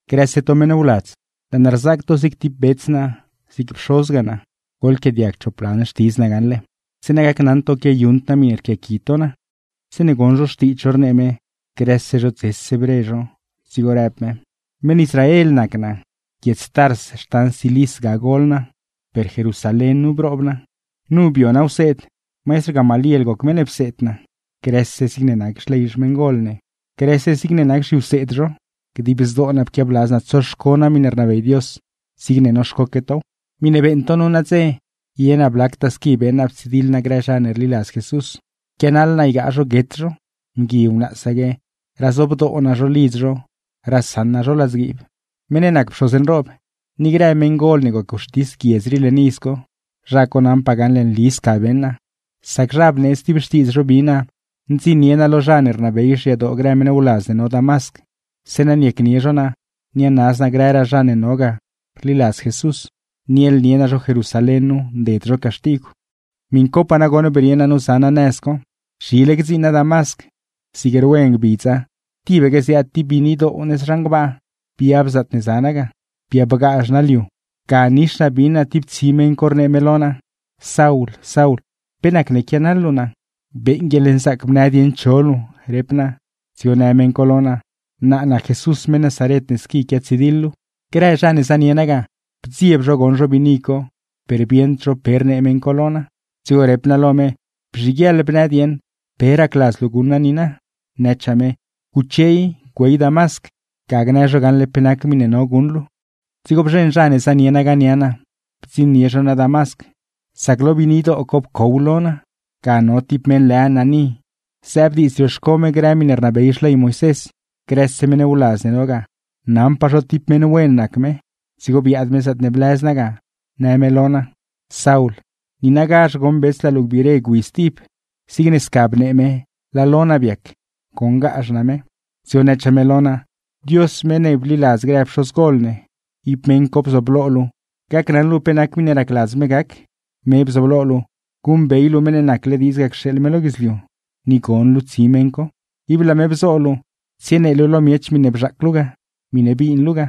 ―Grëse to meṉ wladz, laa naa rzaac to zig ti bets naa zig pxozgaa naa, goḻquiaadiag miṉe gne naa nu gaṉle zeeṉa gacnaṉ to quiayuṉd naa miṉe rquiaqui to naa. Zeeṉe goṉ zho xtiidz zho rnee me, grëse zho dzese bre zho; dzigo rëb me: ―Meṉ Israel nac naa, guiedz Tars xtan Cilis ga gol naa, per Jerusalén nu broob naa, nu bio naa wseed, maistr Gamaliel goc meṉ ne pseed naa. Pseed me naa grëse zigne nac xley xmeṉgol ne, grëse zigne nac zhiwseed zho; pseed me naa tibaque noxco naa ruṉnon naa lë Dios zigne noxcoque tow. Miṉe beeṉ to nu nadze, ye naa blactaa squi beṉ naa ptsidiḻ naa grë zha ne rliladz Jesús, pquianaḻ naa ygaa zho guet zho; mgui wnaasaque razobdoo naa zho lidz zho rasaṉ naa zho ladzguiib. Meṉ ne nac pxoz nroob ni grë meṉgol ne goc wxtis guiedz rii leṉ iz co, zha co naṉpaa gaṉle nli sca beṉ naa; sac zha bneedz ti xtiidz zho bi naa ndziṉnie naa lo zha ne rnabey xyadoo grë meṉ wladz ne no Damasc, zeeṉa niacnie zho naa nianaz naa grëraa zha ne no ga rliladz Jesús, niaḻnie naa zho Jerusalén nu nded zho caxtigw. ’Miṉ copaa nagoṉ brie naa nu za naa nëz co. Zhile gdziṉ naa Damasc, zig rwe ngbidza tibaque zeeṉe ziaad ti biinidoo nëz zhan gbaa biab lo naa. Biabgazh naa liu, ga nix naa bin naa ti tsi meṉ co rnee me lo naa: “Saul, Saul, ¿pe nacne quianaḻ luu naa?” “¡Beeṉ guieḻnzaac bnë dieṉ cho luu!”, rep naa. Dzigo në meṉ co lo naa: “Naa nac Jesús meṉ Nazaret ne squi quiatsidiḻ luu.” ’Grë zha ne zanie naa ga, bdzieb zho goṉ zho biini co, per bieṉd zho pe rnee meṉ co lo naa. Dzigo rep naa lo me: “Bzhiguieḻ bnë dieṉ, ¿pe racladz luu guṉ naa niina?” Nëchaa me: “Guche i, güey Damasc ga gnë zho gaṉle pe nac miṉe no guṉ luu.” ’Dzigo bzheṉ zha ne zanie naa ga nia naa, bdziṉnie zho naa Damasc; sac lo biinidoo co pcow lo naa. Ga no ti mgui lë Ananí, zëëb diidz rioxco me grë miṉe rnabey ley, grëse meṉ wladz ne no ga naṉpaa zho ti meṉ wen nac me; dzigo biaad me zaatne blëz naa ga, në me lo naa: “Saul, niinagazh goṉ bets laa luu gbiire gwi stib.” Zigne sca bnee me laa lo naa biac, goṉgazh naa me. Dzigo nëchaa me lo naa: “Dios meṉ ne bliladz grë pxozgol ne, ib meṉ co bzooblo luu gacnaṉ luu pe nac miṉe racladz me gac, me bzooblo luu guṉbey luu meṉ ne nacle diidz ga cxeeḻ me lo guidzliu, ni gon luu tsi meṉ co. Ib laa me bzo luu tsienee luu lo miech miṉe bzhaac luu ga, miṉe bin luu ga.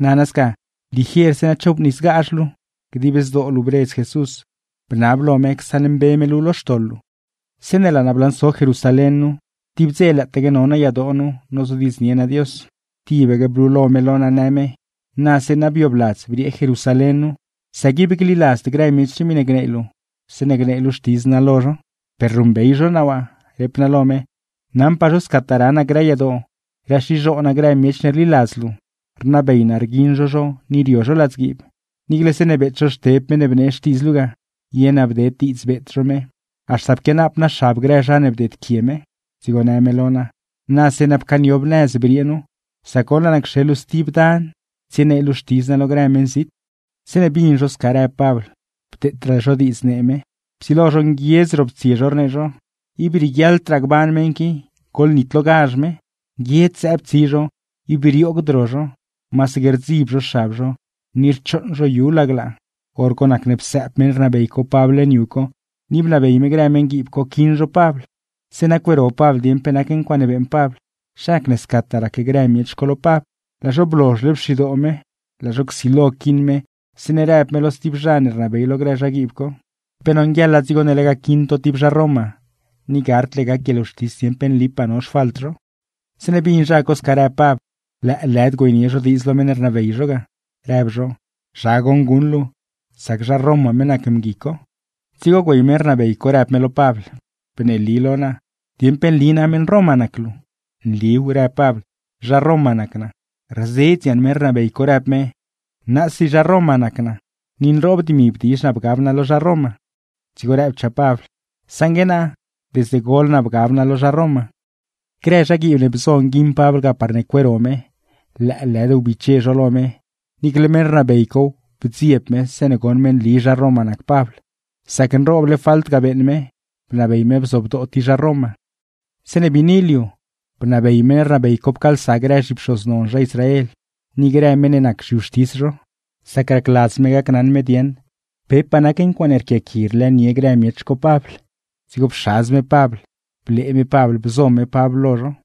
Guso i sca, zeeṉa chobnisgazh luu. Dib zdoo luu bredz Jesús, bnab lo me csaṉmbe me luu lo xtoḻ luu.” ’Zeeṉe laa naa blanso Jerusalén nu, tib dze lëëtaque no naa yadoo nozodiidznie naa Dios, tibaque blulo me lo naa në me: “Na zeeṉa biobladz briee Jerusalén nu, sac ib gliladzd grë miech rii miṉe gnee luu zeeṉe gnee luu xtidz naa lo zho.” “Per ruṉbey zho naa waa”, rep naa lo me, “naṉpaa zho scataa ra naa grë yadoo raxizhoo naa grë miech ne rliladz luu, rnabey naa rguiṉ zho zho ni rio zho ladzguiib, niicle zeeṉe beet zho Xteb meṉ ne bnee xtiidz luu ga, ye naa bded diidz beet zho me, haxta pquianaap naa xab grë zha ne bdeedquie me.” Dzigo në me lo naa: “Na zeeṉa pcaaniob nëz briee nu, sac goṉ laa naa cxeḻ luu stib dan tsienee luu xtidz naa lo grë meṉzit.” Zeeṉe bin zho sca rëb me bdeetraa zho diidz nee me, psilo zho nguiedz roptsie rnee zho: ―¡Ib rieguiaḻdraa gban meṉ qui! ¡Goḻnitlogazh me! Nguiedz zëëb tsi zho, ib rioogd ro zho, masaque rdzib zho xab zho ni rchooṉ zho yudie laglaa. Dzigo psëëb meṉ rnabey co Pabl leṉ yu co, ni bnabey me grë meṉguiib co quiṉ zho Pabl, zeeṉa cueero Pabl dieṉ pe nac ncuaaṉe beeṉ Pabl, zha nac ne scataa rac grë miech co lo Pabl. Laa zho blozhle pxidoo me, laa zho csilo quiṉ me, zeeṉe rëb me lo sti zha ne rnabey lo grë zhaguiib co: ―¿Pe nonguieḻa dzigo ne lega quiṉ to ti zha Roma, ni gardle gac guieḻwxtis dieṉ pe nlipaa no xfalt zho? Zeeṉe bin zha co sca rëb Pabl, lëëlëd güeynie zho diidz lo meṉ ne rnabey zho ga, rëb zho: ―¿Zha goṉ guṉ luu? Sac zha Roma me nac mgui co. Dzigo güey meṉ rnabey co rëb me lo Pabl: ―Bneeli lo naa, ¿dieṉ pe nli na meṉ Roma nac luu? ―Nliw ―rëb Pabl―, zha Roma nac naa. Rzedz yaṉ meṉ rnabey co rëb me: ―¡Naasi zha Roma nac naa, ni nroob dimi bdizh naa bgab naa lo zha Roma! Dzigo rëbchaa Pabl: ―Saṉgue naa, desde gol naa bgab naa lo zha Roma. Grë zhaguiib ne bzo nguiṉ Pabl ga parne cueero me, lëëlëd wbiche zho lo me, niicle meṉ rnabey cow bdzieb me zeeṉe goṉ me nli zha Roma nac Pabl, sac nrooble nac falt ne niuṉ me ga lega nabey me nguiṉ zho ti zha Roma. Zeeṉe biini liu, bnabey meṉ rnabey co pcaalsa grë zhipxoz non zha Israel ni grë meṉ ne nac zhiwxtis zho, sac racladz me gacnaṉ me dieṉ pepaa nac ncuaaṉe rquiaqui rlëënie grë miech co Pabl. Dzigo pxadz me Pabl, blee me Pabl bzo me Pabl lo zho.